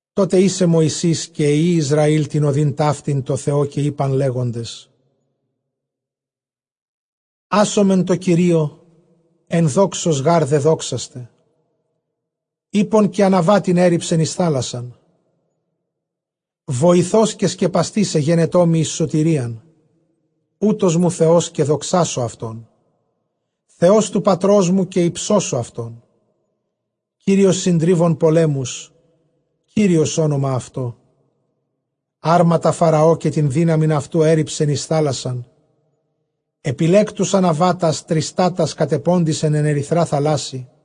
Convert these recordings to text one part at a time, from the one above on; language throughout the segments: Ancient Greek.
Τότε ᾖσε Μωυσῆς καὶ οἱ υἱοὶ Ἰσραὴλ τὴν ᾠδὴν ταύτην τῷ Θεῷ, καὶ εἶπαν, λέγοντες, ᾄσωμεν τῷ Κυρίῳ, ἐνδόξως γὰρ δεδόξασται· ἵππον καὶ ἀναβάτην ἔῤῥιψεν εἰς θάλασσαν. Βοηθὸς καὶ σκεπαστὴς ἐγένετό μοι εἰς σωτηρίαν· οὗτός μου Θεὸς, καὶ δοξάσω αὐτόν· Θεὸς τοῦ πατρός μου, καὶ ὑψώσω αὐτόν. Κύριος συντρίβων πολέμους, Κύριος ὄνομα αὐτῷ. Ἅρματα Φαραὼ, καὶ τὴν δύναμιν αὐτοῦ, ἔῤῥιψεν εἰς θάλασσαν, ἐπιλέκτους ἀναβάτας τριστάτας· κατεπόθησαν ἐν ἐρυθρᾷ θαλάσσῃ·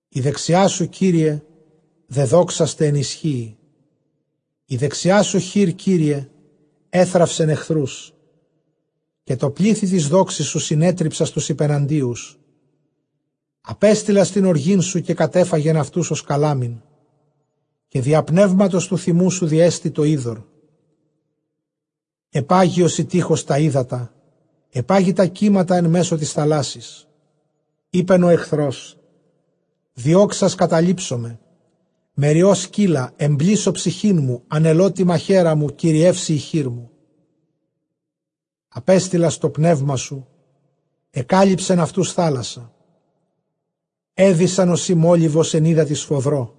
Ἡ δεξιά σου, Κύριε, δεδόξασται ἐν ἰσχύϊ· ἡ δεξιά σου χεὶρ, Κύριε, ἔθραυσεν ἐχθρούς. Καὶ τῷ πλήθει τῆς δόξης σου συνέτριψας τοὺς ὑπεναντίους· ἀπέστειλας τὴν ὀργήν σου κατέφαγεν αὐτοὺς ὡς καλάμην. Καὶ διὰ πνεύματος τοῦ θυμοῦ σου διέστη τὸ ὕδωρ· ἐπάγη ὡσεὶ τεῖχος τὰ ὕδατα· ἐπάγη τὰ κύματα ἐν μέσῳ τῆς θαλάσσης. Εἶπεν ὁ ἐχθρὸς, διώξας καταλήψομαι, μεριῶ σκῦλα· ἐμπλήσω ψυχήν μου, ἀνελῶ τῇ μαχαίρῃ μου, κυριεύσει ἡ χείρ μου. Ἀπέστειλας τὸ πνεῦμά σου· ἐκάλυψεν αὐτοὺς θάλασσα· ἔδυσαν ὡσεὶ μόλιβος ἐν ὕδατι σφοδρῷ.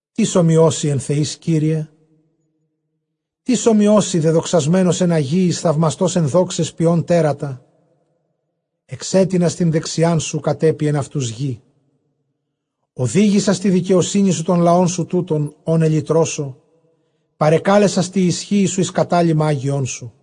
Τίς ὅμοιός σοι ἐν θεοῖς, Κύριε; τίς ὅμοιός σοι; δεδοξασμένος ἐν ἁγίοις, θαυμαστὸς ἐν δόξαις, ποιῶν τέρατα. Ἐξέτεινας τὴν δεξιάν σου· κατέπιεν αὐτοὺς γῆ. Ὡδήγησας τῇ δικαιοσύνῃ σου τὸν λαόν σου τοῦτον, ὃν ἐλυτρώσω· παρεκάλεσας τῇ ἰσχύϊ σου εἰς κατάλυμα ἅγιόν σου.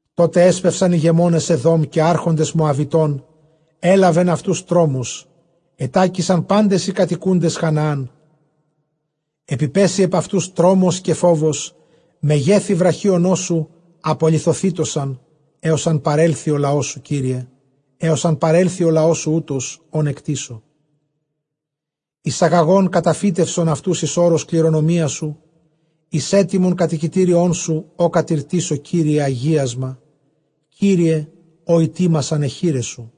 Τότε ἔσπευσαν ἡγεμόνες Ἐδὼμ, καὶ ἄρχοντες Μωαβιτῶν· ἔλαβεν αὐτοὺς τρόμος· ἐτάκησαν πάντες οἱ κατοικοῦντες Χαναάν. Ἐπιπέσοι ἐπʼ αὐτοὺς τρόμος καὶ φόβος· μεγέθει βραχίονός σου ἀπολιθωθήτωσαν, ἕως ἂν παρέλθῃ ὁ λαός σου, Κύριε· ἕως ἂν παρέλθῃ ὁ λαός σου οὗτος, ὃν ἐκτήσω. Εἰσαγαγὼν καταφύτευσον αὐτοὺς εἰς ὄρος κληρονομίας σου, εἰς ἕτοιμον κατοικητήριόν σου, ὃ κατηρτίσω, Κύριε, ἁγίασμα, Κύριε, ὃ ἡτοίμασαν αἱ χεῖρές σου.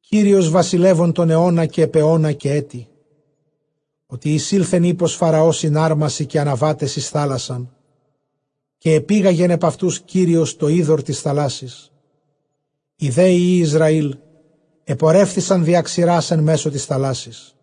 Κύριος βασιλεύων τὸν αἰῶνα, καὶ ἐπʼ αἰῶνα, καὶ ἔτι. Ὅτι εἰσῆλθεν ἵππος Φαραὼ σὺν ἅρμασιν καὶ ἀναβάταις εἰς θάλασσαν, καὶ ἐπήγαγεν ἐπʼ αὐτοὺς Κύριος τὸ ὕδωρ τῆς θαλάσσης· οἱ δὲ υἱοὶ Ἰσραὴλ ἐπορεύθησαν διὰ ξηρᾶς ἐν μέσῳ τῆς θαλάσσης.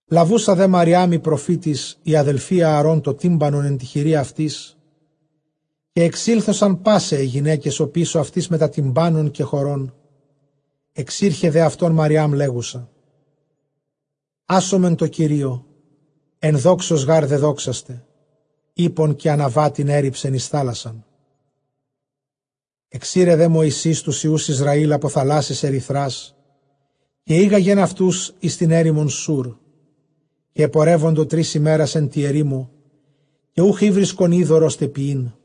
Λαβοῦσα δὲ Μαριὰμ ἡ προφῆτις ἡ ἀδελφὴ Ἀαρὼν τὸ τύμπανον ἐν τῇ χειρὶ αὐτῆς, καὶ ἐξήλθοσαν πᾶσαι αἱ γυναῖκες ὀπίσω αὐτῆς μετὰ τυμπάνων καὶ χορῶν. Ἐξῆρχε δὲ αὐτῶν Μαριὰμ, λέγουσα, ᾄσωμεν τῷ Κυρίῳ, ἐνδόξως γὰρ δεδόξασται· ἵππον καὶ ἀναβάτην ἔῤῥιψεν εἰς θάλασσαν. Ἐξῆρε δὲ Μωυσῆς τοὺς υἱοὺς Ἰσραὴλ ἀπὸ θαλάσσης ἐρυθρᾶς, καὶ ἤγαγεν αὐτοὺς εἰς τὴν ἔρημον Σούρ· καὶ ἐπορεύοντο τρεῖς ἡμέρας ἐν τῇ ἐρήμῳ, καὶ οὐχ ηὕρισκον ὕδωρ, ὥστε πιεῖν.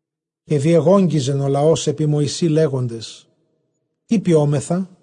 Καὶ διεγόγγυζεν ὁ λαὸς ἐπὶ Μωυσῇ, λέγοντες, τί πιόμεθα;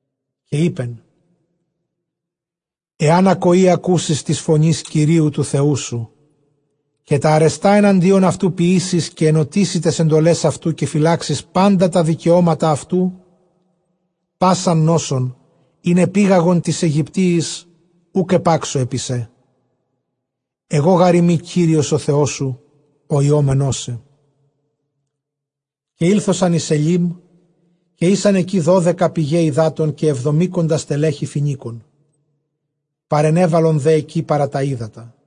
καὶ εἶπεν, ἐὰν ἀκοῇ ἀκούσῃς τῆς φωνῆς Κυρίου τοῦ Θεοῦ σου, καὶ τὰ ἀρεστὰ ἐναντίον αὐτοῦ ποιήσῃς, καὶ ἐνωτίσῃ ταῖς ἐντολαῖς αὐτοῦ, καὶ φυλάξῃς πάντα τὰ δικαιώματα αὐτοῦ, πᾶσαν νόσον, ἣν ἐπήγαγον τοῖς Αἰγυπτίοις, οὐκ ἐπάξω ἐπὶ σέ· ἐγὼ γάρ εἰμι Κύριος ὁ Θεός σου ὁ ἰώμενός σε. Καὶ ἤλθοσαν εἰς Αἰλείμ· καὶ ἦσαν ἐκεῖ δώδεκα πηγαὶ ὑδάτων, καὶ ἑβδομήκοντα στελέχη φοινίκων· παρενέβαλον δὲ ἐκεῖ παρὰ τὰ ὕδατα.